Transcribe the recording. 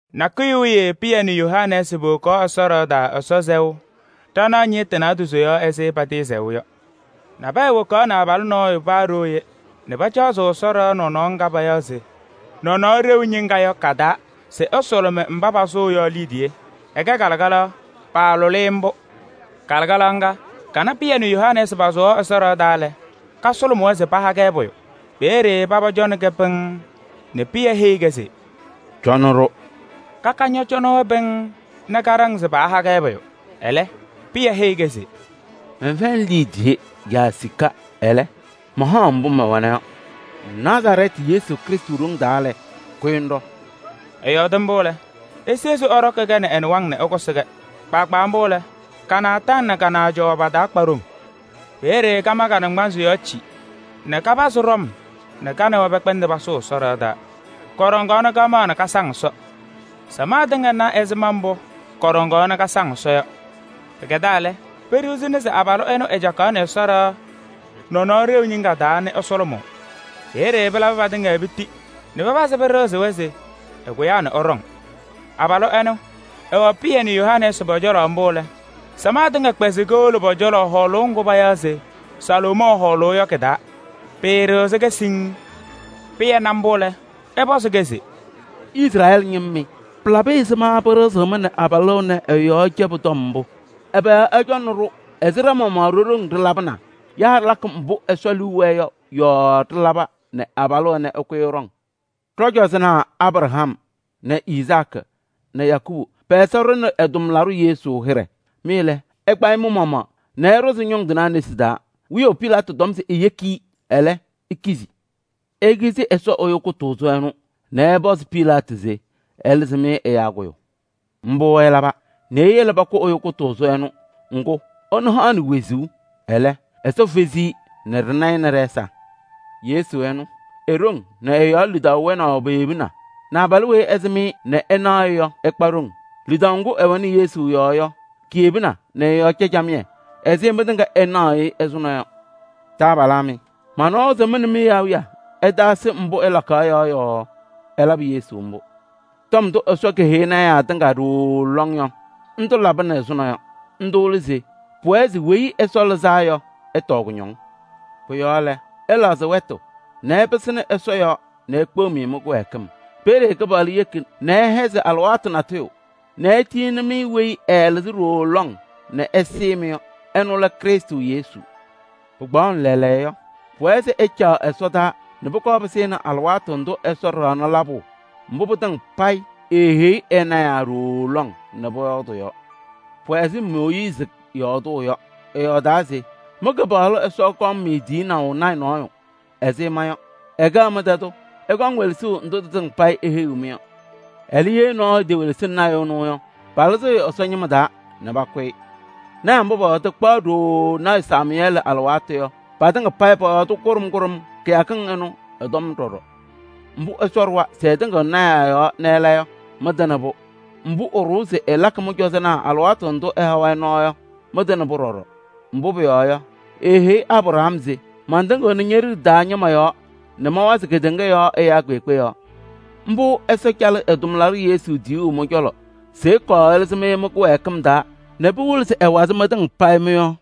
Nakʋyʋ wiye Pɩyɛ nɛ Yohanɛɛsɩ powokaɣ Ɛsɔ ɖɩɣa taa Ɛsɔ sɛʋ ɖanaɣ ñɩɣtʋ naadozo yɔɔ ɛzɩ patɩɩsɛɣʋ yɔ. Nabɛyɛ wokaɣnɩ abalʋ nɔɔyʋ paa ɖooye nɛ pacaɣzɩɣ Ɛsɔ ɖɩɣa nɔnɔɔ ŋga payaɣ se Nɔnɔɔ Ɖeu Ñɩŋga yɔ ka-taa se ɛsʋlʋmɩ mba pasʋʋ yɔ liidiye. Ɛkɛ kalɩkalaɣ, paalʋlɩ-ɩ mbʋ. Kalɩkalaɣ ŋga kana Pɩyɛ nɛ Yohanɛɛsɩ pasʋwaɣ Ɛsɔ ɖɩɣa taa lɛ, kasʋlʋmɩ-wɛ se paha-kɛ pʋyʋ. Peeye Paba cɔnɩ-kɛ pɩŋŋ nɛ Pɩyɛ heyi-kɛ se: “Cɔnɩ-ɖʋ.” Kaka ñɔcɔnɩ-wɛ pɩŋŋ nɛ kaɖaŋ se paaha-kɛ pʋyʋ. Ɛlɛ, Pɩyɛ heyi-kɛ se: “Mɛnfɛyɩnɩ liidiye yaa sika, ɛlɛ, mahaɣ-ŋ mbʋ mɛwɛna yɔ: Nazarɛɛtɩ tʋ Yesu Krɩstʋ ɖoŋ taa lɛ, kʋyɩ ŋɖɔ!” Ɛyɔɔdɩ mbʋ lɛ, esezi ɛɖɔkɩ-kɛ nɛ ɛ-nɩwaŋ nɛ ɛkʋsɩ-kɛ. Kpaagbaa mbʋ lɛ, ka-naataŋ nɛ ka-naajʋwa taa pakpa ɖoŋ. Peeye kama ka-naŋgbanzɩ yɔɔ cim nɛ kapazɩ ɖɔm nɛ ka nɛ wɛ pɛkpɛndɩ pasʋʋ Ɛsɔ ɖɩɣa taa. Kɔɖɔŋaɣ nɛ kamaɣ nɛ kasaŋ Ɛsɔ. Samaɣ tɩŋa na ɛzɩma mbʋ kɔɖɔŋaɣ nɛ kasaŋ Ɛsɔ yɔ. Pɩkɛdaa lɛ, peɖiɣzini se abalʋ ɛnʋ ɛcakaɣnɩ Ɛsɔ ɖɩɣa Nɔnɔɔ Ɖeu Ñɩŋga taa nɛ ɛsʋlʋmʋʋ. Peeye pɩlabɩ patɩŋa piti nɛ pɩpazɩ pɩɖɩɣzɩ-wɛ se ɛkʋyaa nɛ ɛɖɔŋ. Abalʋ ɛnʋ, ɛwɛ Pɩyɛ nɛ Yohanɛɛsɩ pɔ-cɔlɔ mbʋ lɛ, samaɣ tɩŋa kpɛzɩ kowolo pɔ-cɔlɔ hɔɔlʋʋ ŋgʋ payaɣ se Salomɔɔ Hɔɔlʋʋ yɔ kɩ-taa, pɩɩɖɩɣzɩ-kɛ siŋŋ. Pɩyɛ na mbʋ lɛ, ɛpɔzɩ-kɛ se: “Izrɛɛlɩ ñɩma mɩ! Pɩlabɩ ɛzɩma pɩɖɩɣzɩɣ-mɩ nɛ abalʋ ɛnɛ ɛ-yɔɔ cɛbʋ tɔm mbʋ? Ɛbɛ yɔɔ ɩcɔnɩ-ɖʋ ɛzɩ ɖa-maɣmaɣ ɖo-ɖoŋ ɖɩlabɩnaa yaa ɖɩlakɩ mbʋ Ɛsɔ liu wɛɛ yɔ yɔɔ ɖɩlaba nɛ abalʋ ɛnɛ ɛkʋyɩ ɛɖɔŋ? Ɖɔ-cɔzɔnaa Abraham nɛ Izaakɩ nɛ Yakɔɔbʋ pɛ-Ɛsɔ ɖʋnɩ ɛ-tʋmlaɖʋ Yesu hɩɖɛ. Mɩ lɛ, ɩkpa-ɩ mɩ-maɣmaɣ nɛ ɩɖʋzɩ ñʋŋ tɩnaa nesi taa. Wiyaʋ Pilaatɩ tɔm se eyeki-i, ɛlɛ, ikizi. Ikizi Ɛsɔ Ɛyʋ Kʋtʋʋzʋ ɛnʋ nɛ ɩpɔzɩ Pilaatɩ se ɛlɩzɩ-mɩ ɛyaa kʋyʋ. Mbʋ ɩlaba nɛ iyele pakʋ Ɛyʋ Kʋtʋʋzʋ ɛnʋ, ŋgʋ ɛnʋ haɣnɩ wezuu. Ɛlɛ, Ɛsɔ fezi-i nɛ ɖɩna-ɩ nɛ ɖɛ-ɛza. Yesu ɛnʋ, e-ɖoŋ nɛ ɛ-yɔɔ lidaʋ wɛnaʋ peyebina nɛ abalʋ weyi ɩsɩm-ɩ nɛ ɩnaɣ-ɩ yɔ, ɛkpa ɖoŋ. Lidaʋ ŋgʋ ɛwɛnɩ Yesu yɔɔ yɔ kiyebina nɛ ɛ-yɔɔ cɛ camɩyɛ ɛzɩ mɩtɩŋa ɩnaɣʋ-ɩ ɛzʋnɔ yɔ. Taabalaa mɩ! Manawa se mɩ nɛ mɩ-awiya ɩtaasɩ mbʋ ɩlakaɣ yɔ yɔɔ ɩlabɩ Yesu mbʋ. Tɔm ndʋ Ɛsɔ keheyi lɔɔyɩsɩ tɩnaa tɩŋa ɖooo lɔŋ yɔ, ndʋ labɩnɩ ɛzʋnɔ yɔ. Ndʋ lɛ se pʋwɛɛ se Weyi Ɛsɔ Lɩzaa Yɔ ɛtɔɔ kʋñɔŋ. Pʋ-yɔɔ lɛ, ɩlɛɣzɩ wɛtʋ nɛ ɩpɩsɩnɩ Ɛsɔ yɔɔ nɛ ekpeɣ-mɩ mɩ-kɩwɛɛkɩm. Peeye Kɩpaɣlʋ yeki nɛ ɩhɛzɩ alɩwaatʋ natʋyʋ nɛ etiyini-mɩ weyi ɛɛlɩzɩ ɖooo lɔŋ nɛ ɛsɩɩ-mɩ yɔ. Ɛnʋ lɛ Krɩstʋ Yesu. Pɩkpaɣʋnɩ lɛɛlɛɛyɔ yɔ, pʋwɛɛ se ɛcaɣ ɛsɔdaa nɛ pʋkɔɔ pɩsɩnɩ alɩwaatʋ ndʋ Ɛsɔ ɖaɣnɩ labʋ mbʋ pɩtɩŋa payɩ eeheyi ɛ-lɔɔyɩsɩ tɩnaa ɖooo lɔŋ nɛ pɔyɔɔdɩ yɔ. Pʋwɛ ɛzɩ Mooyiizi yɔɔdʋʋ yɔ. Ɛyɔɔdaa se: ‘Mɩ-Kɩpaɣlʋ Ɛsɔ kɔŋ-mɩ tiyinaʋ lɔɔyaɣ tʋ nɔɔyʋ ɛzɩ ma yɔ, ɛkɛɣ mɩ-tɛ tʋ. Ɩkɔŋ welesuu ndʋ tɩtɩŋa eheyiɣ-mɩ yɔ. Ɛlɛ, ye nɔɔyʋ etewelesini lɔɔyaɣ tʋ ɛnʋ yɔ, palɩzɩɣ-ɩ Ɛsɔ ñɩma taa nɛ pakʋ-ɩ.’ Lɔɔyɩsɩ tɩnaa mba pɔyɔɔdɩ kpaɣ ɖooo lɔɔyaɣ tʋ Samʋyɛɛlɩ alɩwaatʋ yɔ, patɩŋa payɩ pɔyɔɔdɩ kʋɖʋm kʋɖʋm kɩyakɩŋ ɩnʋ ɩ-tɔm ɖɔɖɔ. Mbʋ Ɛsɔ ɖʋwa se ɛtɩŋɩɣnɩ lɔɔyɩsɩ tɩnaa yɔɔ nɛ ɛla yɔ, mɩtɩnɩ-pʋ. Mbʋ ɛɖʋwa se ɛlakɩ mɩ-cɔzɔnaa alɩwaatʋ ndʋ ɛha-wɛ nɔɔ yɔ, mɩtɩnɩ-pʋ ɖɔɖɔ. Mbʋ pʋyɔɔ yɔ, eeheyi Abraham se: ‘Matɩŋɩɣnɩ ñe-liɖe taa ñɩma yɔɔ nɛ mawazɩ kedeŋa yɔɔ ɛyaa kpeekpe yɔɔ.’ Mbʋ Ɛsɔ calɩ ɛ-tʋmlaɖʋ Yesu tiyuu mɩ-cɔlɔ se ɛkɔɔ ɛlɩzɩ-mɩ mɩ-kɩwɛɛkɩm taa nɛ pɩwɩlɩ se ɛwazɩ mɩtɩŋa payɩ mɩ-yɔɔ.”